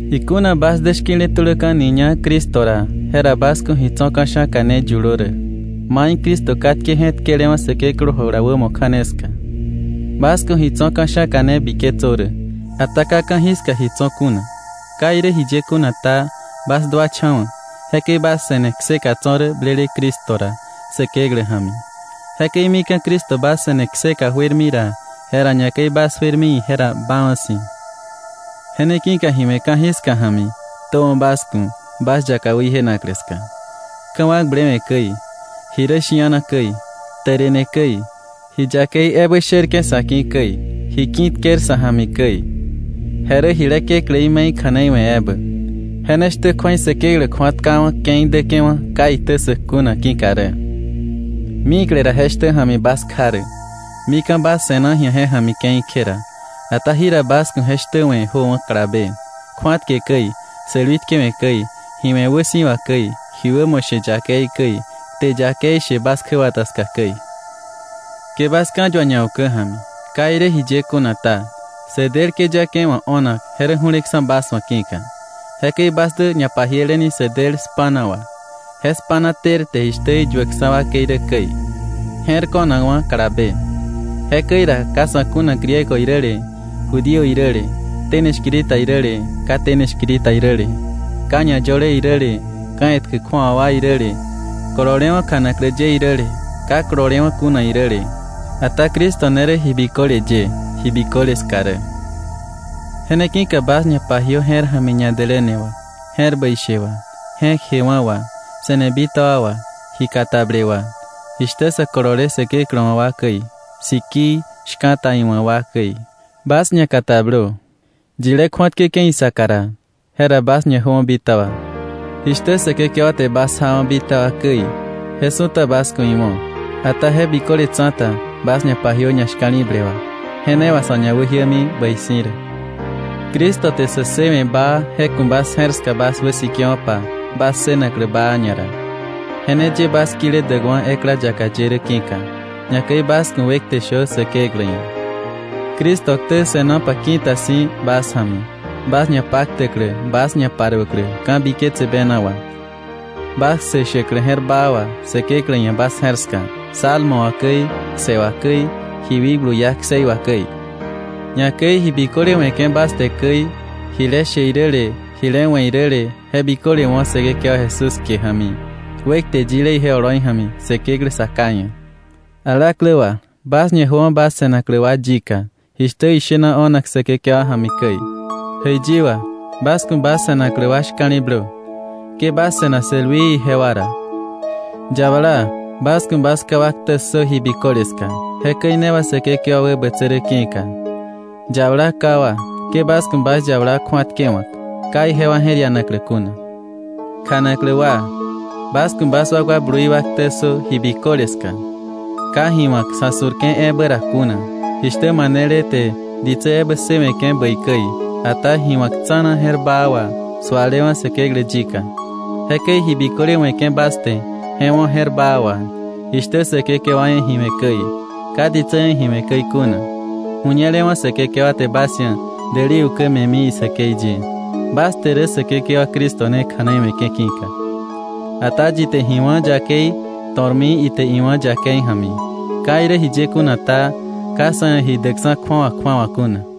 Ikuna bas dä shki̱le tuläka̱niña Cristo ra, jera bas ku̱ ji tso̱ ka̱sha̱ka ne yulö rä, mai Cristo katke je̱tkelewa̱ Säkeklä jula wämo kja̱ne ska. Bas ku̱ ji tso̱ ka̱sha̱ka ne biketsö rä, ata ka ka̱jiska ji tso̱ kuna. Ka irä jiye kuna ta, bas duacha̱wa̱, jekäi bas se̱ne kseka tso̱ rä blele Cristo ra Säkeklä ja̱mi. Jekäi mika̱ Cristo bas se̱ne kseka juermi ra, jera ñakäi bas juermi ije ra baawa̱ si̱. Je ne ki̱ka ji we̱ ka̱jiska ja̱mi ktöwa̱ bas ku̱ bas yaka wäjienaklä ska, ka̱wakblewe̱ käi, ji rä shi̱ana käi, tärene käi, ji yakei ebä sherke̱ sa̱ ki̱ käi, ji ki̱tker sa̱ ja̱mi käi. Je rä jile kekläí me̱i kja̱nei we̱ ebä. Je ne shtä kju̱ei Säkeklä kju̱atkawa̱ ke̱i däke̱wa̱ ka iktä ssäk kuna ki̱ka rä. Mikle ra je shtä ja̱mi bas kja rä, mika̱ bas se̱na ji̱a je ja̱mi ke̱i kje ra. Ata jira bas ku̱ je shtä we̱ jöwa̱ kalabe: kju̱atke käi, sälwi tkewe̱ käi, ji we̱ wäsi̱wa käi, ji wämo she yakei käi, kte yakei she bas kjäbata ska käi. Ke bas ka̱yua ñaukä ja̱mi. Ka irä jiye kuna ta, sä del këyake wa̱ o̱nak je rä ju̱leksa̱ bas wa̱ ki̱ka. Jekäi bas dä ñapajieleni sä del spa̱na wà. Je spa̱na tërte, jishtä iyuäkksa̱ wakei rä käi, je̱r ko̱nakwa̱ kalabe. Jekäi ra ka sa̱ kuna Griego iräle Judío iräle, tene shkiri ta iräle ka tene shkiri ta iräle, ka ñayöle iräle, ka̱ etkä kju̱awa wa iräle, kololewa̱ kjanaklä ye iräle ka kololewa̱ kuna iräle. Ata Cristo ne rä ji biköle ye, ji biköle ska rä. Je ne ki̱ka bas ñapajiö je̱r ja̱mi ñadäläne wà, je̱r bäi she wà, je̱k jewa̱ wà, se̱ne bitaba wà, ji katable wà, jishtä sä kolole Säkeklä wa̱ wa käi, sikii, shka̱ta iwa̱ wa käi. Bas ñakatablö; yilé kju̱atkäke̱ isaka ra, jera bas ñajöwa̱ bitaba. Jishtä Säkekewa te bas jawa̱ bitaba käi, je su̱ta bas ku̱ iwo̱. Ata je biköle tsa̱ta bas ñapajiö ñashka̱li̱ble wà, je ne wà sa̱ ñawäjiämi bäi si̱ rä. Cristo te sä ssëwe̱ baa, je ku̱ bas je̱r ska bas wäsikewo̱pa bas ssënaklä baa ñara, je ne ye bas kile däkwa̱ ekla yaka ye rä ki̱ka. Ñakäi bas ku̱ wekte shö Säkeklä ia̱. Cristo ktä se̱nopa ki̱ta si̱ bas ja̱mi, bas ñapaktäklä bas ñaparuäklä ka̱biketse bena wà, bas kse shäklä je̱r baa wà Säkeklä ia̱ bas je̱r ska, salmo wà käi, kse wà käi, ji wikblu iá kseí wà käi. Ñakäi ji biköle we̱ke̱ bas te käi, jile she iräle jile we̱ iräle, je biköle wo̱ Säkekewa Jesús kie ja̱mi, wekte yile ije oloi ja̱mi Säkeklä Sa Ká ia̱. Alaklä wa, bas ñajöwa̱ bas se̱naklä wa yika jishtä ishena o̱nak Säkekewa ja̱mi käi. Jäiyi wa, bas ku̱ bas se̱naklä wa shka̱li̱blö. Ke bas se̱na sälwii ijewa ra. Yabala, bas ku̱ bas ká wa ktä ssö ji biköle ska, jekäi ne wà Säkekewa wäbätsä rä ki̱ka. Yabala ká wa, ke bas ku̱ bas yabala kju̱atkewa̱k, ka ijewa je̱r ianaklä kuna. Kjanaklä wa, bas ku̱ bas wakwa blui wa ktä ssö ji biköle ska, ka ji wa̱k sa̱ su̱rke̱ ebä ra kuna, jishtä manele te ditsä ebä ssëwe̱ke̱ bäi käi, ata ji wa̱k tsa̱na je̱r baa wà, sualewa̱ Säkeklä yika. Jekäi ji biköle we̱ke̱ bas te, je wo̱ je̱r baa wà, jishtä Säkekewa ia̱ ji we̱ käi, ka ditsä ia̱ ji we̱ käi kuna, ju̱ñelewa̱ Säkekewa te bas ia̱ däli ukä me̱mi isäkei ye, bas te rä Säkekewa Cristo ne kja̱nei we̱ke̱ ki̱ka. Ata yi te ji wá̱ yakei to̱rmi ite iwá̱ yakei ja̱mi. Ka irä jiye kuna ta, ka sa̱ ia̱ ji däkksa̱ kju̱awa kju̱awa kuna.